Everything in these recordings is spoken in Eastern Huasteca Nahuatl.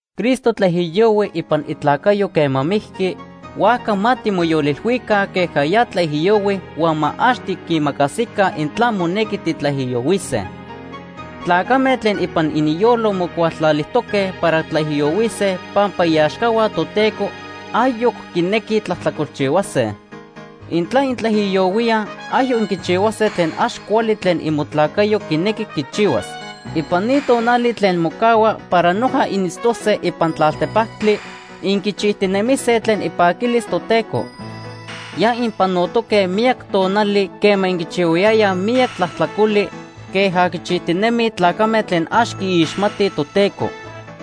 Cristo tlaijiyohui ipan itlacayo quema mijqui, huajca ma timoyolilhuica queja ya tlaijiyohui huan ma ax tiquimacasica intla monequi titlaijiyohuise. Tlacame tlen ipan ininyolo mocualtlalijtoque para tlaijiyohuise pampa iaxcahua Toteco ayoc quinequij tlajtlacolchihuase. Intla intlaijiyohuíaj, ayoc inquichihuase tlen ax cuali tlen imotlacayo quinequi quichihuas. Ipan ni tonali tlen mocahua para noja initztose ipan tlaltepactli, inquichijtinemise tlen ipaquilis Toteco. Ya inpanotoque miyac tonali quema inquichihuayayaj miyac tlajtlacoli queja quichijtinemij tlacame tlen ax quiixmatij Toteco.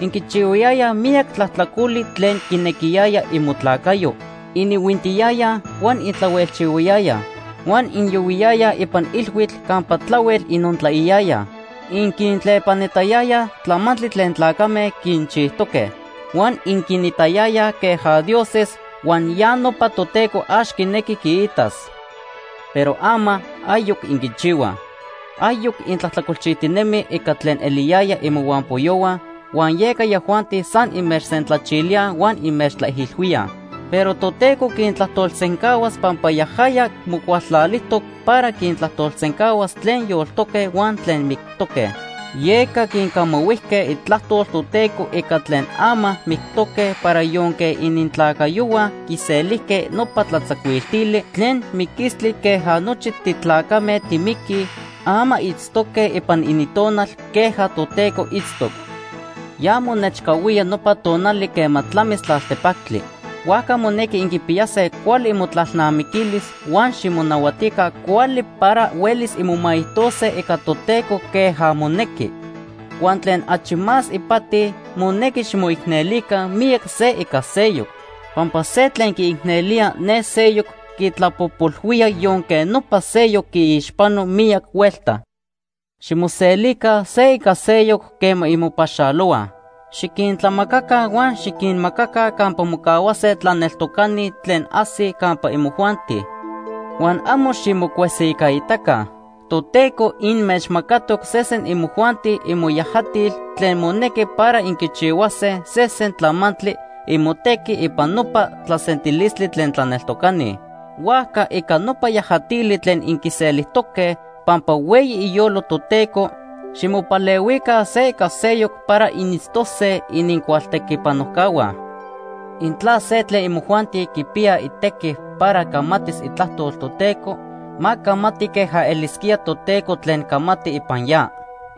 Inquichihuayayaj miyac tlajtlacoli tlen quinequiyaya imotlacayo. Inihuintiyayaj, huan intlahuejchihuayayaj, huan inyohuiyayaj ipan ilhuitl campa tlahuel inontlaiyayaj. Inquintlepanitayayaj tlamantli tlen tlacame quinchijtoque, huan inquinitayayaj queja dioses, huan ya nopa Toteco ax quinequi quiitas. Pero ama ayoc inquichihuaj. Ayoc intlajtlacolchijtinemij ica tlen eliyayaj imohuampoyohua, huan yeca yajuanti san inmechsentlachilíaj huan inmechtlaijilhuíaj. Pero Toteco quintlajtolsencahuas pampa yajaya mocualtlalijtoc para quintlajtolsencahuas tlen yoltoque huan tlen mictoque. Yeca quincamahuijque itlajtol Toteco ica tlen ama mictoque para yonque inintlacayohua quiselijque nopa tlatzacuiltili tlen miquistli queja nochi titlacame timiquij, ama itztoque ipan inintonal queja Toteco itztoc. Ya monechcahuía nopa tonali quema tlamis tlaltepactli. Huajca monequi inquipiyase cuali imotlalnamiquilis huan ximonahuatica cuali para huelis inmomaijtose ica Toteco queja monequi. Huan tlen achi más ipati, monequi ximoicnelica miyac se ica seyoc, pampa se tlen quiicnelía ne seyoc quitlapojpolhuía yonque nopa seyoc quiixpano miyac huelta. Ximoselica se ica seyoc quema inmopaxalohuaj. Xiquintlamacaca huan xiquinmacaca campa mocahuase tlaneltocani tlen ajsij campa imojuanti, huan amo ximocuesijcaitaca. Toteco inmechmacatoc sesen imojuanti imoyajatil tlen monequi para inquichihuase sesen tlamantli imotequi ipan nopa tlasentilistli tlen tlaneltocani. Huajca ica nopa yajatili tlen inquiselijtoque pampa hueyi iyolo Toteco, ximopalehuica se ica seyoc para initztose inincualtequipanojcahua. Intla se tlen imojuanti quipiya itequi para camatis itlajtol Toteco, ma camati queja elisquía Toteco tlen camati ipan ya.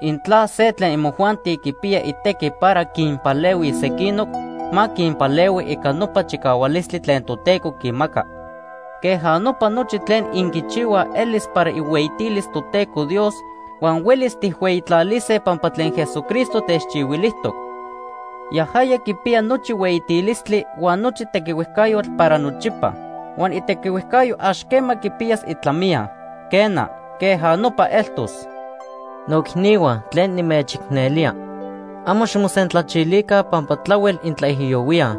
Intla se tlen imojuanti quipiya itequi para quinpalehuis sequinoc, ma quinpalehui ica nopa chicahualistli tlen Toteco quimaca. Queja nopa nochi tlen inquichihuaj elis para ihueyitilis Toteco Dios, huan huelis tijhueyitlalise pampa tlen Jesucristo techchihuilijtoc. Yajaya quipiya nochi hueyitilistli huan nochi tequihuejcayotl para nochipa. Huan itequihuejcayo ax quema quipiyas itlamiya. Quena, queja nopa eltos. Noicnihua tlen nimechicnelía, amo ximosentlachilica pampa tlahuel intlaijiyohuíaj.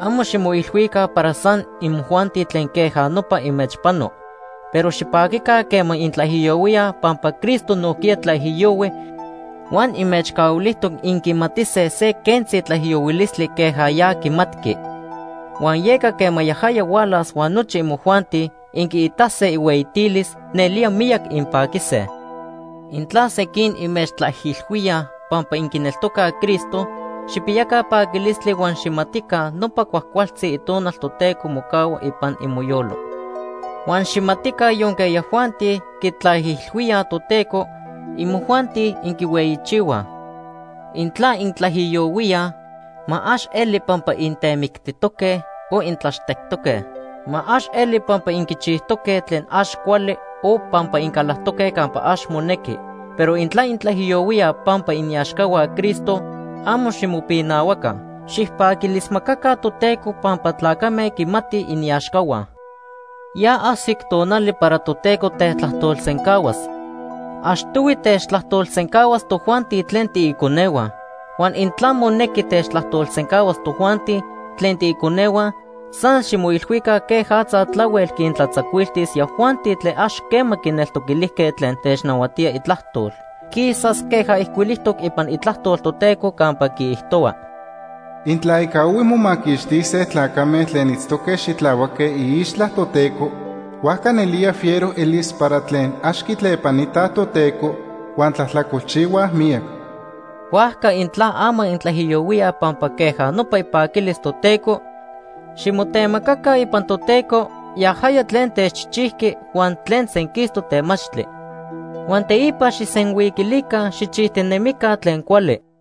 Amo ximoilhuica para san imojuanti tlen queja nopa inmechpano. Pero xipaquica quema intlaijiyohuíaj pampa Cristo nojquiya tlaijiyohui huan inmechcahuilijtoc inquimatise se quentzi tlaijiyohuilistli queja ya quimatqui. Huan yeca quema yajaya hualas huan nochi imojuanti inquiitase ihueyitilis, nelía miyac inpaquise. Intla sequin inmechtlaijilhuíaj pampa inquineltocaj Cristo, xijpiyaca paquilistli huan xijmatica nopa cuajcualtzi Itonal Toteco mocahua ipan imoyolo. Huan xijmatica yonque yajuanti quitlaijilhuíaj Toteco, imojuanti inquihueyichihuaj. Intla intlaijiyohuíaj, ma ax eli pampa intemictijtoque o intlaxtectoque. Ma ax eli pampa inquichijtoque tlen ax cuali o pampa incalactoque campa ax monequi. Pero intla intlaijiyohuíaj pampa iniaxcahua Cristo, amo ximopinahuaca. Xijpaquilismacaca Toteco pampa tlacame quimatij iniaxcahua. Ya ajsic tonali para Toteco tetlajtolsencahuas. Achtohui techtlajtolsencahuas tojuanti tlen tiiconehua. Huan intla monequi techtlajtolsencahuas tojuanti tlen tiiconehua, san ximoilhuica quejatza tlahuel quintlatzacuiltis yajuanti tlen ax quema quineltoquilijtoque tlen technahuatía itlajtol. Quisas queja ijcuilijtoc ipan Itlajtol Toteco campa quiijtohua: “Intla ica ohui momaquixtise tlacame tlen itztoque xitlahuaque iixtla Toteco, huajca nelía fiero elis para tlen ax quitlepanitaj Toteco huan tlajtlacolchihuaj miyac.” Huajca intla ama intlaijiyohuíaj pampa queja nopa ipaquilis Toteco, ximotemacaca ipan Toteco, yajaya tlen techchijchijqui huan tlen senquistoc temachtli. Huan teipa xijsenhuiquilica xijchijtinemica tlen cuali.